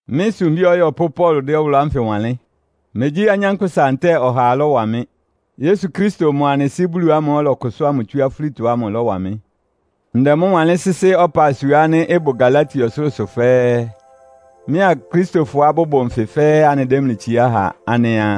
Mɩ́ sumbí ɔyɔpʋ́ Paulo dɛ́ ɔwʋlʋ́ ánfɩ wanlɩ́n. Megyí anyánkpʋ́sa ntɛ́ɛ ɔhaa lɔ́wa mɩ́. Yesu Kristo mʋa anɩ Sɩ́ Bulu ámʋ́ʋ́ ɔlɔkʋsʋ́a mʋ tsú afúlitɔ ámʋ lɔ́wa mɩ́. Ndɛ mʋ́ wanlɩ́n sɩ́sɩ́ ɔpasua ánɩ́ ɩbʋ Galatia ɔsʋlʋ́sʋ fɛ́ɛ́. Mɩ́a Akristofɔá bʋbʋ nfɩ fɛ́ɛ́ anɩdɛ́ mlɩ itsiá ha anɩa,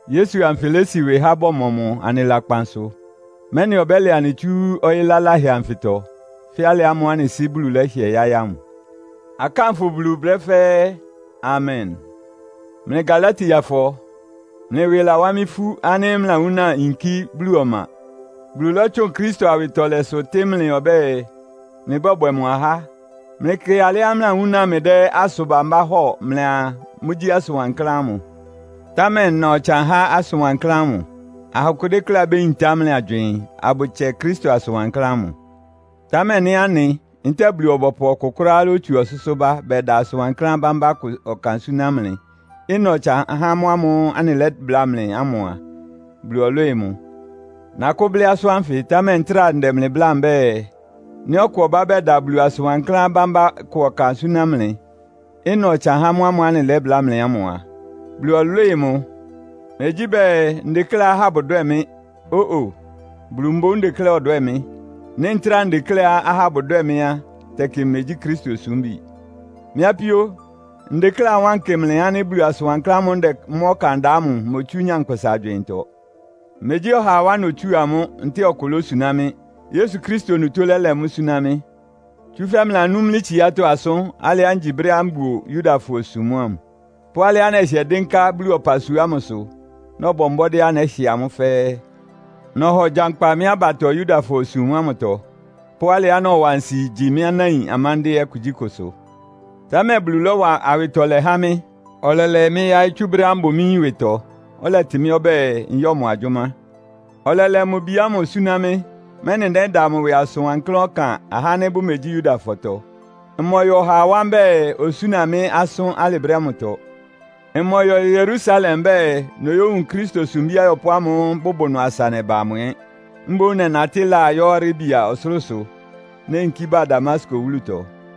Yesu anfɩ lési ɩwɩ há bɔmɔ mʋ anɩ lakpan sʋ, mɛ́nɩ ɔbɛ́lɛ anɩ tsú ɔyɩ́ laláhɛ anfɩtɔ; fɛ́ alɩ ámʋ́ʋ́ anɩ Sɩ́ Bulu lɛ́hɩɛ yáɩ́ ámʋ. Akánfʋ Bulu brɛ́ fɛ́ɛ́. Amen! Mlɩ Galatiafɔ, mlɩ ɩwɩ lawá mɩ́ ifú ánɩ́ mlɩlawúna yinkí Bulu ɔma. Bulu lɔ́tsʋn Kristo awɩtɔlɛsʋ tɩ́ mlɩ ɔbɛ́ɛ, mlɩbɔ́bwɛ mʋ ahá. Mlɩkɩ alɩá mlɩlawúna mlɩdɛ́ asʋn bambá hɔ́ɔ mlɩaa, mʋ́gyí asʋn wankláán ámʋ. Támɛ ɩna ɔtsan há asʋn wankláán ámʋ. Aha akʋ dékléá béyintá mlɩ agywɩɩn, abʋtsɛ Kristo asʋn wankláán ámʋ. Támɛ nɩ́ anɩ, ntɛ́ɛ Bulu-ɔbɔpʋ ɔkʋ kʋ́ráá lótsu ɔsʋ́sʋ́ bá, bɛda asʋn wankláán bambá kʋ ɔkan súná mlɩ, ɩna ɔtsan há mʋ́ ámʋ́ʋ́ anɩlɛ́bláa mlɩ ámʋ a, Bulu ɔlwɩ́ɩ mʋ. Nakʋ́ blɩ́ asʋ́n ánfɩ, támɛ ntráa ndɛ mlɩ bláa mbɛ́ɛ, nɩ́ ɔkʋ ɔbá bɛda Bulu asʋn wankláán bámbá kʋ ɔkan súná mlɩ, ɩna ɔtsan há mʋ́ ámʋ́ʋ́ anɩlɛ́bláa mlɩ ámʋ a, Bulu ɔlwɩ́ɩ mʋ. Megyí bɛɛ, ndekléá ahá bʋdwɛ́ɛ mɩ́. Ó-o! Bulu mboún ndekléá ɔdwɛ́ɛ mɩ́. Nɩ́ ntráa ndekléá ahá bʋdwɛ́ɛ mɩ́ á, tɛkɩ mmegyí Kristo osúmbi. Mɩ́ apíó, ndekléá ɩwánkɩ mlɩ ánɩ́ Bulu asʋn wankláán ámʋ́ʋ́ ndɛ mʋ́ ɔkan da ámʋ imotsú nyankpʋsa agywɩɩntɔ. Megyí ɔhaa wá notsúa mʋ́, ntɛ́ɛ ɔkʋ lósuná mɩ́. Yesu Kristo onutó lɛ́lɛ mʋ́ súná mɩ́. Tsúfɛ́ mlɩlanú mɩ́ tsiátɔ́ asʋ́n, alɩá ngyi brɛ́á mbuo Yudafɔ-osum ámʋ, pʋ́ alɩá nɛhɩɛ dɩ́nká Bulu ɔpasua ámʋsʋ, nɔbɔ mbɔ́dɩ́á nɛ́hɩ amʋ́ fɛ́ɛ́. Nɔhɔ gyankpa mɩ́ abatɔ Yudafɔ-osum ámʋtɔ, pʋ́ alɩá nɔwa nsi gyi mɩ́ anáin amándɩ́ɛ́ kugyíkʋsʋ. Támɛ Bulu lɔ́wa awɩtɔlɛ há mɩ́. Ɔlɛlɛ mɩ́ yáɩ́ tsú brɛ́á mbʋ mɩ́ yín ɩwɩtɔ, ɔlɛtɩ mɩ́ ɔbɛ́ɛ, nyɔ́ mʋ agyʋ́má. Ɔlɛlɛ mʋ Bi ámʋ súná mɩ́, mɛ́nɩ nɛ́da mʋ ɩwɩ asʋn wankláán ɔkan ahá ánɩ́ bʋmegyí Yudafɔtɔ. Mmɔyɔ ɔhaa wá mbɛ́ɛ, osúna mɩ́ asʋ́n alɩ brɛ́ ámʋtɔ. Mmɔyɔ Yerusalem mbɛ́ɛ, noyówun Kristo sumbí ayɔpʋ́ ámʋ́ʋ́ bʋbʋ ɩnʋ asa nɛba amʋ ɛ́. Mboún nɛnatɩ́ laa yɔ́ Arabia ɔsʋlʋ́sʋ, neyinkí ba Damasko wúlutɔ.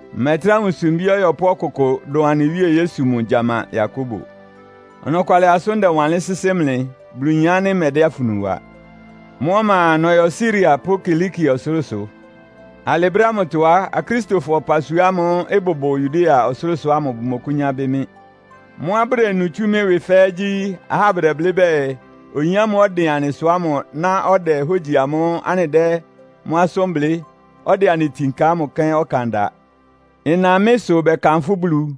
Mmɛtrá wun sumbí ɔyɔpʋ́ ɔkʋkʋ dʋn anɩ Wíe Yesu mʋ gyama Yakobo. Ɔnɔkwalɩ asʋ́n ndɛwanlɩ́n sɩ́sɩ́ mlɩ. Bulu yin ánɩ́ mmɛdɛ́ afunu wa. Mʋ́ ɔma a, nɔyɔ Siria pʋ́ Kilikia ɔsʋlʋ́sʋ. Alɩ brɛ́ ámʋtɔ á, Akristofɔ ɔpasua ámʋ́ʋ́ ɩbʋbʋ Yudea ɔsʋlʋ́sʋ ámʋ bʋmɔkʋ́nyá bɩ́ mɩ́. Mʋ́á bʋdenu tsú mɩ́ ɩwɩ fɛ́ɛ́ gyí, ahá bʋdɛblɩ́ bɛɛ, “Oyin ámʋ́ʋ́ ɔdɩn anɩsʋ ámʋ ná ɔdɛ hógyi amʋ́ʋ́ anɩdɛ́ mʋ́ asʋ́n blɩ́, ɔdɛ anɩ itin ka ámʋ kɛ́n ɔkan da.” Ɩna mɩ́ sʋ bɛkanfʋ́ Bulu.